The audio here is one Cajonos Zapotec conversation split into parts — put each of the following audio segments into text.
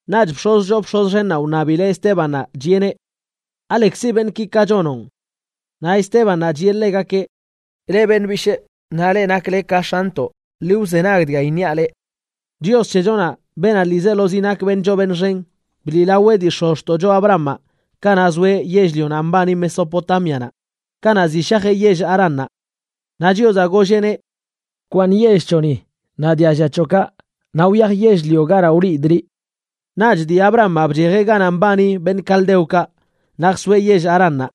Naꞌch bx̱oz choo bx̱oz xennaꞌ wṉabileꞌ Estébannaꞌ, chiꞌeneꞌ: ―¿Alekzi beṉꞌki ka chonoꞌn? Naꞌ Estébannaꞌ chiꞌe ḻegakeꞌ: ―Leꞌ beṉꞌ bishꞌ naꞌ leꞌ nakle ka x̱antoꞌ, ḻi wzenag dga iṉiaꞌ leꞌ: Chios c̱hechonaꞌ, beenaꞌ ḻiizelozi nak beṉꞌ choo beṉꞌ xen, bliꞌlaweꞌ dii x̱ozxtoꞌcho Abrahamaꞌ kanaꞌ zoeꞌ yell-lionaꞌ mbani Mesopotámianaꞌ, kanaꞌ ziꞌ shajeꞌ yell Haránnaꞌ. Naꞌ Chiozaꞌ golleꞌneꞌ: “Bkwaaṉ yell c̱hoꞌni naꞌ dialla c̱hoꞌkaꞌ, naꞌ wyaj yell-lio ganaꞌ wliidꞌ liꞌ.” Naꞌch dii Abrahamaꞌ bchejeꞌ ganaꞌ mbani beṉꞌ caldeokaꞌ naꞌ jsoeꞌ yell Haránnaꞌ.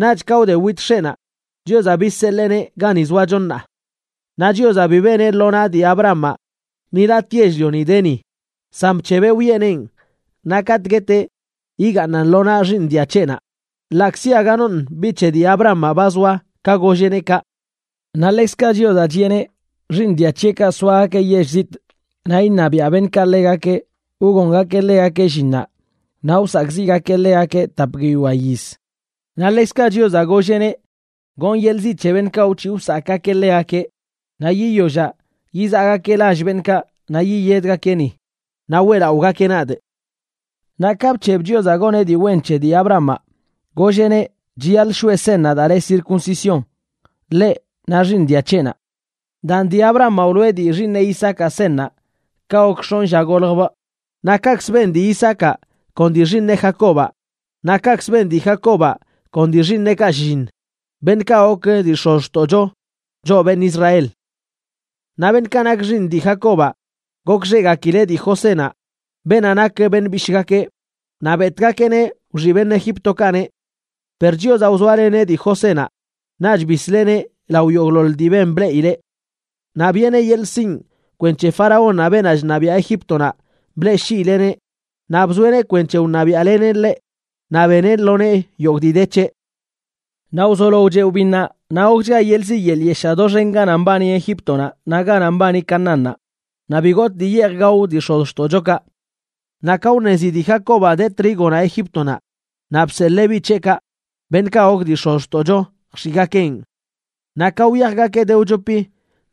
Naꞌch ka wde wit x̱eꞌnaꞌ, Chiozaꞌ bizseḻeeneꞌ gani zoacho ṉaa. Naꞌ Chiozaꞌ bi beneꞌ lo naꞌ dii Abrahamaꞌ ni latꞌ yell-lioni de ni, san bc̱hebeꞌ wiꞌeneꞌn naꞌ katꞌ gueteꞌ yigaaṉan lo naꞌ xiiṉ dia c̱heꞌnaꞌ, ḻaꞌkzi aga noṉꞌ biꞌ c̱he dii Abrahamaꞌ ba zoa ka golleꞌneꞌ kaꞌ. Naꞌ ḻekzkaꞌ Chiozaꞌ chiꞌeneꞌ xiiṉ dia c̱heꞌkaꞌ soagakeꞌ yell zitꞌ naꞌ iṉabiaꞌ beṉꞌkaꞌ ḻegakeꞌ wgongakeꞌ ḻegakeꞌ llinnaꞌ, naꞌ wsakꞌziꞌgakeꞌ ḻegakeꞌ tap guiyoa yiz. Naꞌ ḻekzkaꞌ Chiozaꞌ golleꞌneꞌ: “Gonꞌ yeḻꞌ ziꞌ c̱he beṉꞌkaꞌ wc̱hiꞌ wsakꞌgakeꞌ ḻegakeꞌ, naꞌ yiyollaꞌ yizaꞌgakeꞌ lall beṉꞌkaꞌ naꞌ yiyedgakeꞌ ni, naꞌ weꞌlaꞌogakeꞌ nadꞌ.” Naꞌ ka bc̱heb Chiozaꞌ goneꞌ dii wen c̱he dii Abrahamaꞌ, golleꞌneꞌ chiyaḻꞌ shoꞌe seṉnaꞌ daa le circuncisión, ḻeꞌ naꞌ xiiṉ dia c̱heꞌnaꞌ. Daan, dii Abrahamaꞌ wloꞌe dii xiiṉeꞌ Isaacaꞌ seṉnaꞌ ka gok x̱onꞌ lla goljbꞌ, naꞌ kaꞌkzə ben dii Isaacaꞌ kon dii xiiṉeꞌ Jacobaꞌ, naꞌ kaꞌkz ben dii Jacobaꞌ kon dii xiiṉeꞌkaꞌ shlliṉ, beṉꞌkaꞌ gok dii x̱ozxtoꞌcho, choꞌ beṉꞌ Israel. ’Naꞌ beṉꞌkaꞌ nak xiiṉ dii Jacobaꞌ, gokxeꞌgakileꞌ dii Josénaꞌ, beenaꞌ nak beṉꞌ bishꞌgakeꞌ, naꞌ betꞌgakeꞌneꞌ wxiꞌ beṉꞌ Egíptokaꞌneꞌ. Per Chiozaꞌ wzoaleneꞌ dii Josénaꞌ, naꞌch bisleꞌneꞌ lao yogꞌḻoḻ dii ben bleꞌileꞌ. Naꞌ biꞌeneꞌ yeḻꞌ sinꞌ kwenc̱he faraónnaꞌ, beenaꞌ chṉabiaꞌ Egíptonaꞌ, bleꞌshiileꞌneꞌ naꞌ bzoeꞌneꞌ kwenc̱he wṉabiaꞌleneꞌ ḻeꞌ naꞌ beneꞌ lo nee yogꞌ dii de c̱heꞌ. ’Naꞌ wzolo wcheꞌ wbinnaꞌ, naꞌ gokchga yeḻꞌ ziꞌ yeḻꞌ yeshaa doxen ganaꞌ mbani Egíptonaꞌ naꞌ ganaꞌ mbani Canaánnaꞌ, naꞌ bi gotꞌ dii yeej gao dii x̱ozxtoꞌchokaꞌ. Naꞌ ka wṉezi dii Jacobaꞌ de trígonaꞌ Egíptonaꞌ, naꞌ bseḻee biꞌ c̱heꞌkaꞌ, beṉꞌkaꞌ gok dii x̱ozxtoꞌcho, jx̱iꞌgakeꞌn. Naꞌ ka wyajgakeꞌ de wchopi,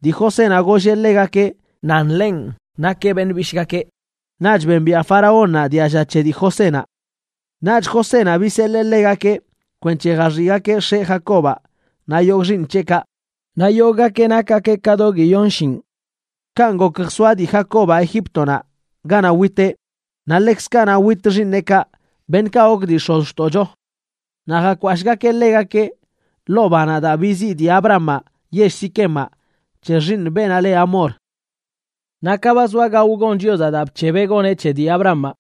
dii Josénaꞌ golleꞌ ḻegakeꞌ nan ḻenꞌ nakeꞌ beṉꞌ bishꞌgakeꞌ, naꞌch bembiaꞌ faraónnaꞌ dialla c̱he dii Josénaꞌ. Naꞌch Josénaꞌ biseḻee ḻegakeꞌ kwenc̱he jaxiꞌgakeꞌ x̱eꞌ, Jacobaꞌ, naꞌ yogꞌ xiiṉ c̱heꞌkaꞌ. Naꞌ yogꞌgakeꞌ nakgakeꞌ ka do guiyon shinꞌ. Kanꞌ gok jsoa dii Jacobaꞌ Egíptonaꞌ ganaꞌ witeꞌ, naꞌ ḻekzkaꞌ naꞌ wit xiiṉeꞌkaꞌ, beṉꞌkaꞌ gok dii x̱ozxtoꞌcho. Naꞌ jakwashꞌgakeꞌ ḻegakeꞌ ḻoo banaꞌ daa biziꞌ dii Abrahamaꞌ yell Siquemaꞌ c̱he xiiṉ beenaꞌ le Hamor. ’Naꞌ ka ba zoa gao gon Chiozaꞌ daa bc̱hebeꞌ goneꞌ c̱he dii Abrahamaꞌ,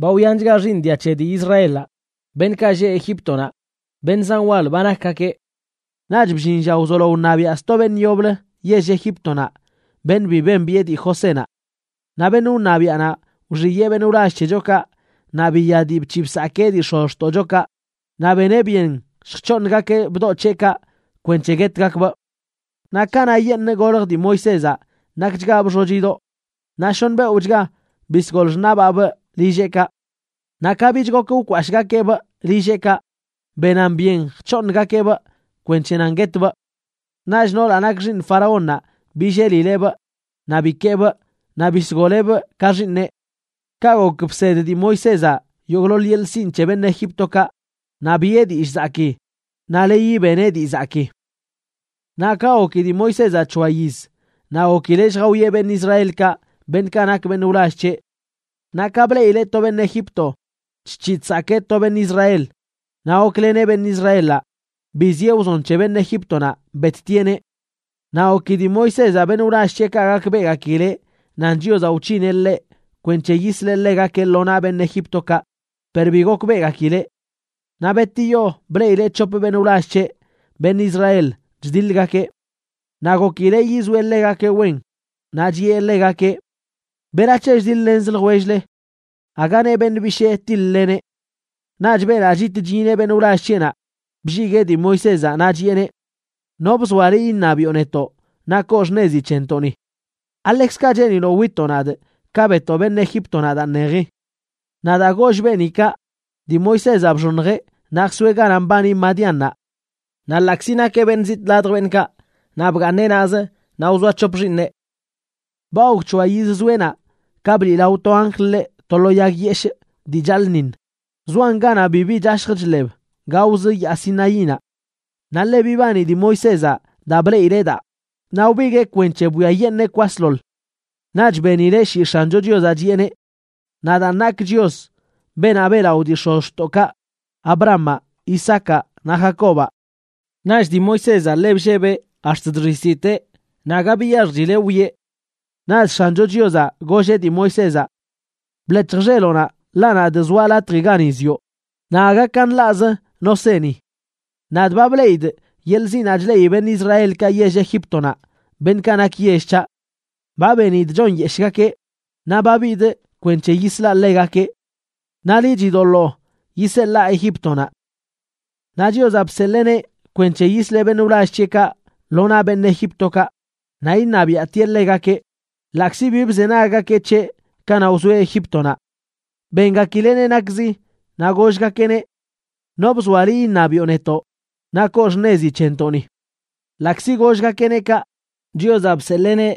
ba wyanchga xiiṉ dia c̱he dii Israelaꞌ, beṉꞌkaꞌ lleꞌ Egíptonaꞌ, beṉꞌ zan wal ba nakgakeꞌ. Naꞌch bllin lla wzolo wṉabiaꞌ sto beṉꞌ yoblə yell Egíptonaꞌ, beṉꞌ bi bembiꞌe dii Josénaꞌ. Naꞌ beṉꞌ wṉabiaꞌnaꞌ wxiyee beṉꞌ wlall c̱hechokaꞌ naꞌ biya dii bc̱hiꞌ bsakee dii x̱ozxtoꞌchokaꞌ, naꞌ beneꞌ byen lljc̱hooṉgakeꞌ bdoꞌdoꞌ c̱heꞌkaꞌ kwenc̱he guetgakbꞌ. Naꞌ kanaꞌyeṉꞌ golj dii Moisézaꞌ, nakchgabꞌ xochidoꞌ, naꞌ shoṉ beoꞌchga bisgol x̱axnaꞌbaabꞌ lilleꞌkaꞌ. Naꞌ ka bich gok wkwashꞌgakeꞌbꞌ lilleꞌkaꞌ, benan byen jc̱hoongakeꞌbꞌ kwenc̱he nan guetbꞌ. Naꞌch noolaꞌ nak xiiṉ faraónnaꞌ billelileꞌbꞌ naꞌ bikeebꞌ naꞌ bisgoleꞌbꞌ ka xiiṉeꞌ. Kaꞌ gok bsed dii Moisézaꞌ yogꞌḻoḻ yeḻꞌ sinꞌ c̱he beṉꞌ Egíptokaꞌ naꞌ biꞌe dillꞌ zakii naꞌ leyi beneꞌ dii zakii. ’Naꞌ ka goki dii Moisézaꞌ c̱hoa yiz, naꞌ gokileꞌ lljawieꞌ beṉꞌ Israelkaꞌ, beṉꞌkaꞌ nak beṉꞌ wlall c̱heꞌ. Naꞌ ka bleꞌileꞌ to beṉꞌ Egipto chc̱hiꞌ chsakee to beṉꞌ Israel, naꞌ gokleneꞌ beṉꞌ Israelaꞌ, biziꞌe wzon c̱he beṉꞌ Egíptonaꞌ, bettieꞌneꞌ. Naꞌ goki dii Moisézaꞌ beṉꞌ wlall c̱heꞌkaꞌ gakbeꞌgakileꞌ nan Chiozaꞌ wc̱hineꞌ ḻeꞌ kwenc̱he yisleꞌ ḻegakeꞌ lo naꞌ beṉꞌ Egíptokaꞌ, per bi gokbeꞌgakileꞌ. Naꞌ betiyo bleꞌileꞌ c̱hop beṉꞌ wlall c̱heꞌ, beṉꞌ Israel, chdiḻgakeꞌ. Naꞌ gokileꞌ yizoeꞌ ḻegakeꞌ wen, naꞌ chiꞌe ḻegakeꞌ: “¿Berac̱he chdiḻ-lenzə ljwell-le?, aga neꞌ beṉꞌ bishee tiḻ-leneꞌ.” Naꞌch beenaꞌ chit chyineꞌ beṉꞌ wlall c̱heꞌnaꞌ blliguee dii Moisézaꞌ naꞌ chiꞌeneꞌ: “¿No bzoa liꞌ iṉabiꞌo netoꞌ naꞌ koo xṉezi c̱hentoꞌni? ¿Aḻekzkaꞌ cheeniloꞌ witoꞌ nadꞌ ka betoꞌ beṉꞌ Egíptonaꞌ daa ṉeji?” Naꞌ daa goll beeni kaꞌ, dii Moisézaꞌ bxoṉjeꞌ naꞌ jsoeꞌ ganaꞌ mbani Madiánnaꞌ. Naꞌ ḻaꞌkzi nakeꞌ beṉꞌ zitꞌ ladj beṉꞌkaꞌ, naꞌ bgaaṉeꞌ naꞌz naꞌ wzoa c̱hop xiiṉeꞌ. ’Ba gok c̱hoa yiz zoeꞌ naꞌ, ka bliꞌlao to anjl ḻeꞌ to lo yag yeshꞌ dii chaḻꞌṉiṉ, zoan ganaꞌ bibi chashj chḻeb gaoz Yaa Sinaínaꞌ. Naꞌ ḻe bibani dii Moisézaꞌ daa bleꞌileꞌ daa, naꞌ wbiguee kwenc̱he bwiayeṉee kwasḻoḻ. Naꞌch benileꞌ shii X̱ancho Chiozaꞌ, chiꞌeneꞌ: “Nadaan nakꞌ Chios, beenaꞌ beꞌlaꞌo dii x̱ozxtoꞌkaꞌ, Abrahamaꞌ, Isaacaꞌ naꞌ Jacobaꞌ.” Naꞌch dii Moisézaꞌ ḻe bllebeꞌ ax̱t chxiztiteꞌ, naꞌ aga biyaxjchileꞌ wwieꞌ. Naꞌch X̱ancho Chiozaꞌ golleꞌ dii Moisézaꞌ: “Bḻec̱hj xeloꞌnaꞌ, ḻaꞌ nadꞌ zoaꞌ latji gani zioꞌ, naꞌ aga ka nḻaꞌz no se ni. Nadꞌ ba bleꞌidꞌ yeḻꞌ ziꞌnaꞌ chleꞌi beṉꞌ Israelkaꞌ yell Egíptonaꞌ, beṉꞌkaꞌ nak yell c̱haꞌ. Ba benidꞌ chonyeshꞌgakeꞌ, naꞌ ba bidꞌ kwenc̱he yislaꞌ ḻegakeꞌ. Naꞌ liꞌ, chidoḻoo yiseḻaa Egíptonaꞌ.” ’Naꞌ Chiozaꞌ bseḻeeneꞌ kwenc̱he yisleꞌ beṉꞌ wlall c̱heꞌkaꞌ lo naꞌ beṉꞌ Egíptokaꞌ, naꞌ iṉabiaꞌtieꞌ ḻegakeꞌ, ḻaꞌkzi bi bzenaggakeꞌ c̱heꞌ kanaꞌ wzoeꞌ Egíptonaꞌ. Bengakileꞌneꞌ nakzi, naꞌ gollgakeꞌneꞌ: “¿No bzoa liꞌ iṉabiꞌo netoꞌ naꞌ koo xṉezi c̱hentoꞌni?” Ḻaꞌkzi gollgakeꞌ kaꞌ, Chiozaꞌ bseḻeeneꞌ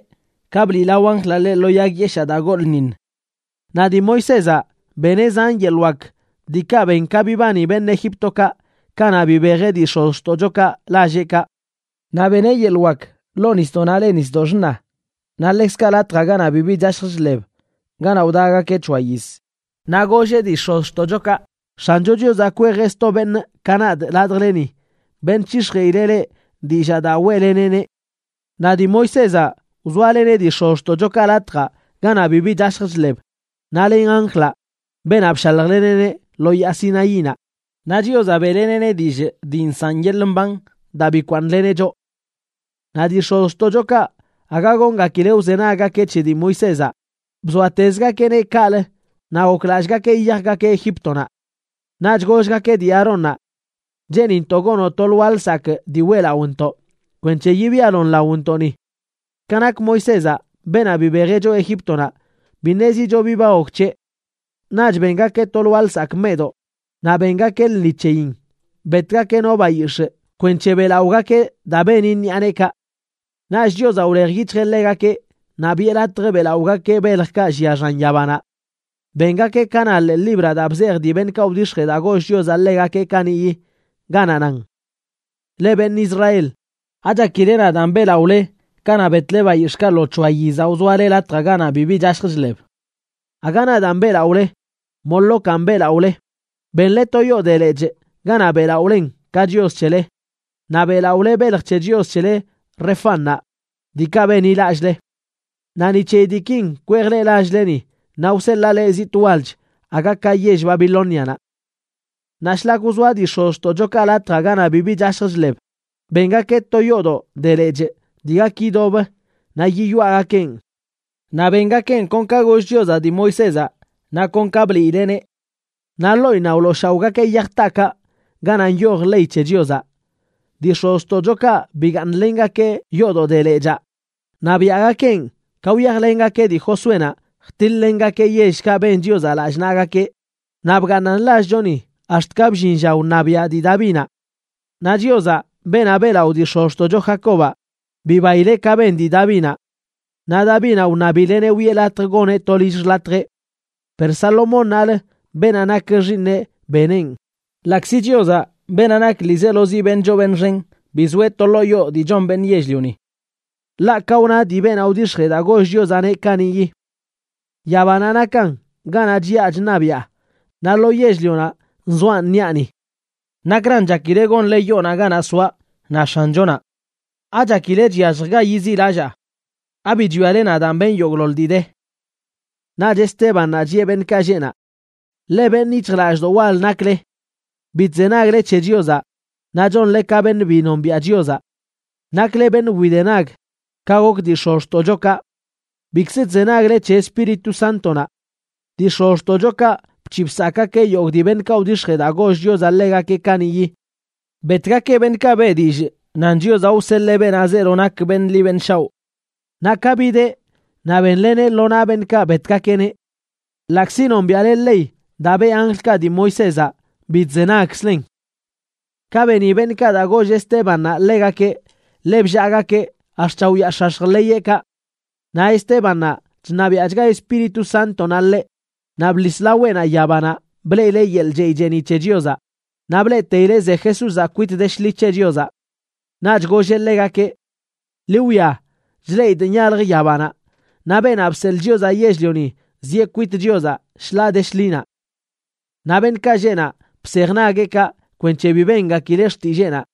ka bliꞌlao anjlaꞌ ḻeꞌ lo yag yeshaa daa goḻꞌṉiṉ. Naꞌ dii Moisézaꞌ beneꞌ zan yeḻꞌ wak diikaꞌ ben ka bibani beṉꞌ Egíptokaꞌ kanaꞌ bibejeꞌ dii x̱ozxtoꞌchokaꞌ lalleꞌkaꞌ. Naꞌ beneꞌ yeḻꞌ wak ḻoo nisdoꞌnaꞌ le Nisdoꞌ Xṉa, naꞌ ḻekzkaꞌ latjaꞌ ganaꞌ bibi chashj chḻeb ganaꞌ wdagakeꞌ c̱hoa yiz. Naꞌ golleꞌ dii x̱ozxtoꞌchokaꞌ: “X̱ancho Chiozaꞌ kwejeꞌ sto beṉꞌ ka nadꞌ ladjleni, beṉꞌ c̱hix̱jeꞌileꞌ leꞌ dillaa daa weꞌleneꞌneꞌ.” Naꞌ dii Moisézaꞌ wzoaleneꞌ dii x̱ozxtoꞌchokaꞌ latjaꞌ ganaꞌ bibi chashj chḻeb, naꞌ len anjlaꞌ, beenaꞌ bshaljleneꞌneꞌ lo yaa Sinaínaꞌ, naꞌ Chiozaꞌ beꞌleneꞌneꞌ dillꞌ dii nsaꞌn yeḻꞌ mban daa bikwaaṉleneꞌ choꞌ. ’Naꞌ dii x̱ozxtoꞌchokaꞌ aga goongakileꞌ wzenaggakeꞌ c̱he dii Moisézaꞌ, bzoatezgakeꞌneꞌ kaꞌlə naꞌ goklallꞌgakeꞌ yiyajgakeꞌ Egíptonaꞌ. Naꞌch gollgakeꞌ dii Aarónnaꞌ: “Cheenintoꞌ gonoꞌ to lwaa lsakꞌ dii weꞌlaꞌontoꞌ, kwenc̱he yibialon laontoꞌni. Ka nak Moisézaꞌ, beenaꞌ bibejeꞌ choꞌ Egíptonaꞌ, bi ṉezicho bi ba gok c̱heꞌ.” Naꞌch bengakeꞌ to lwaa lsakꞌ meꞌdoꞌ naꞌ bengakeꞌ lṉi c̱heyin, betgakeꞌ no bayix̱ꞌ kwenc̱he beꞌlaꞌogakeꞌ daa beni ṉiꞌa neekaꞌ. Naꞌch Chiozaꞌ wlej yic̱hjeꞌ ḻegakeꞌ naꞌ biꞌe latj beꞌlaꞌogakeꞌ beljkaꞌ llia xan yabanaꞌ. Bengakeꞌ ka na ḻee libraꞌ daa bzej dii beṉꞌkaꞌ wdix̱jee daa goll Chiozaꞌ ḻegakeꞌ kaniꞌyi, ganaꞌ nan: Leꞌ, beṉꞌ Israel, ¿Achakile nadaan beꞌlaꞌole kanaꞌ betle bayix̱ꞌkaꞌ lo c̱hoa yizaꞌ wzoale latjaꞌ ganaꞌ bibi chashj chḻeb? Aga nadaan beꞌlaꞌole. Molocanꞌ beꞌlaꞌole, benle to yoo de lechꞌ ganaꞌ beꞌlaꞌolen ka chios c̱hele, naꞌ beꞌlaꞌole belj c̱he chios c̱hele Refánnaꞌ, diikaꞌ benḻilallꞌle. Naꞌ ni c̱heyi diikin kwejꞌ leꞌ lall-leni, naꞌ wseḻaa leꞌ zitꞌ walch aga ka yell Babilónianaꞌ. ’Naꞌ shlak wzoa dii x̱ozxtoꞌchokaꞌ latjaꞌ ganaꞌ bibi chashj chḻeb, bengakeꞌ to yoodoꞌ de lechꞌ dii gak yidob naꞌ yiyoaꞌgakeꞌn. Naꞌ bengakeꞌn kon ka goll Chiozaꞌ dii Moisézaꞌ, naꞌ kon ka bliileꞌneꞌ. Naꞌ ḻoꞌinnaꞌ wlooshaoꞌgakeꞌ yaj taakaꞌ ganaꞌ nyoj ley c̱he Chiozaꞌ. Dii x̱ozxtoꞌchokaꞌ bigaaṉlengakeꞌ yoodoꞌ de lechaa, naꞌ biaꞌgakeꞌn ka wyajlengakeꞌ dii Josuénaꞌ jtiḻ-lengakeꞌ yellkaꞌ ben Chiozaꞌ lallꞌ naꞌgakeꞌ, naꞌ bgaaṉan lallchoni ax̱t ka bllin lla wṉabiaꞌ dii Davinaꞌ. Naꞌ Chiozaꞌ, beenaꞌ beꞌlaꞌo dii x̱ozxtoꞌcho Jacobaꞌ, bibaileꞌ ka ben dii Davinaꞌ. Naꞌ Davinaꞌ wṉabileꞌneꞌ wiꞌe latj goneꞌ to lill xḻatjeꞌ. Per Salomónnaꞌlə, beenaꞌ nak xiiṉeꞌ, beneꞌn ḻaꞌkzi Chiozaꞌ, beenaꞌ nak ḻiizelozi beṉꞌ choo beṉꞌ xen, bi zoeꞌ to ḻoo yoo dii chon beṉꞌ yell-lioni. Ḻaꞌ ka wna dii beenaꞌ wdix̱jee daa goll Chiozaꞌneꞌ kaniꞌyi: Yabanaꞌ nakan ganaꞌ chiꞌa chṉabiꞌa, naꞌ lo yell-lionaꞌ nzoaꞌ ṉiꞌani. ¿Nakran chakile gonle yoonaꞌ ganaꞌ soaꞌ?, na X̱anchonaꞌ. ¿Achakile chyallj ga yiziꞌlallaa? ¿Abi chwiale nadaan benꞌ yogꞌḻoḻ dii de? ’Naꞌch Estébannaꞌ chiꞌe beṉꞌkaꞌ lleꞌ naꞌ: ―Ḻe beṉꞌ yic̱hjlallꞌdoꞌ wal nakle. Bi chzenagle c̱he Chiozaꞌ naꞌ chonle ka beṉꞌ bi nombiaꞌ Chiozaꞌ. Nakle beṉꞌ widenag ka gok dii x̱ozxtoꞌchokaꞌ. Bikzə chzenagle c̱he Espíritu Sántonaꞌ. Dii x̱ozxtoꞌchokaꞌ bc̱hiꞌ bsakꞌgakeꞌ yogꞌ dii beṉꞌkaꞌ wdix̱jee daa goll Chiozaꞌ ḻegakeꞌ kaniꞌyi. Betgakeꞌ beṉꞌkaꞌ beꞌ dillꞌ nan Chiozaꞌ wseḻee beenaꞌ zeelo nak beṉꞌ ḻi beṉꞌ shaoꞌ. Naꞌ ka bideꞌ naꞌ bénleneꞌ lo naꞌ beṉꞌkaꞌ betgakeꞌneꞌ. Ḻaꞌkzi nombiaꞌle ley daa beꞌ anjlkaꞌ dii Moisézaꞌ, bi chzenagkzlen. Ka beni beṉꞌkaꞌ daa goll Estébannaꞌ ḻegakeꞌ, ḻe bllaagakeꞌ ax̱t chaoyaax̱ax̱j ḻeyeꞌkaꞌ. Naꞌ Estébannaꞌ, chṉabiaꞌchga Espíritu Sántonaꞌ ḻeꞌ, naꞌ bḻis laweꞌnaꞌ yabanaꞌ bleꞌileꞌ yeḻꞌ chey cheeniꞌ c̱he Chiozaꞌ, naꞌ bleꞌteileꞌ ze Jesúzaꞌ kwit de shḻi c̱he Chiozaꞌ. Naꞌch golleꞌ ḻegakeꞌ: ―¡Ḻi wwia! Chleꞌidꞌ nyalj yabanaꞌ, naꞌ Beenaꞌ Bseḻꞌ Chiozaꞌ Yell-lioni zieꞌ kwit Chiozaꞌ shḻaa de shḻinaꞌ. Naꞌ beṉꞌkaꞌ lleꞌ naꞌ bsej nagueꞌkaꞌ kwenc̱he bi bengakileꞌ xtilleenaꞌ,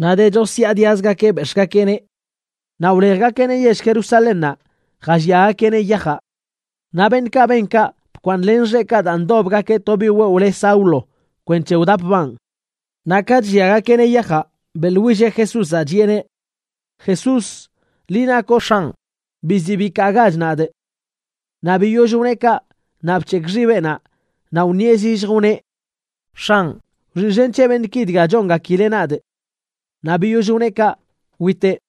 naꞌ de chosyaadiazgakeꞌ bex̱ꞌgakeꞌneꞌ. Naꞌ wlejgakeꞌneꞌ yell Jerusalénnaꞌ jalliagakeꞌneꞌ yajaꞌ. Naꞌ beṉꞌkaꞌ ben kaꞌ bkwaaṉlen xeꞌkaꞌ daa ndobgakeꞌ to biꞌ wewꞌ le Saulo kwenc̱he wdapbaan. Naꞌ ka chlliagakeꞌneꞌ yajaꞌ, beꞌḻwilleꞌ Jesúzaꞌ, chiꞌeneꞌ: ―Jesús, liꞌ nakoꞌ X̱anꞌ, biziꞌ bikaagach nadꞌ. Naꞌ biyoll wneꞌ kaꞌ, naꞌ bc̱hekꞌ xibeꞌnaꞌ naꞌ wṉieꞌ zillj, wneꞌ: ―X̱anꞌ, wxiꞌxen c̱he beṉꞌki dga chongakileꞌ nadꞌ. Naꞌ biyoll wneꞌ kaꞌ witeꞌ.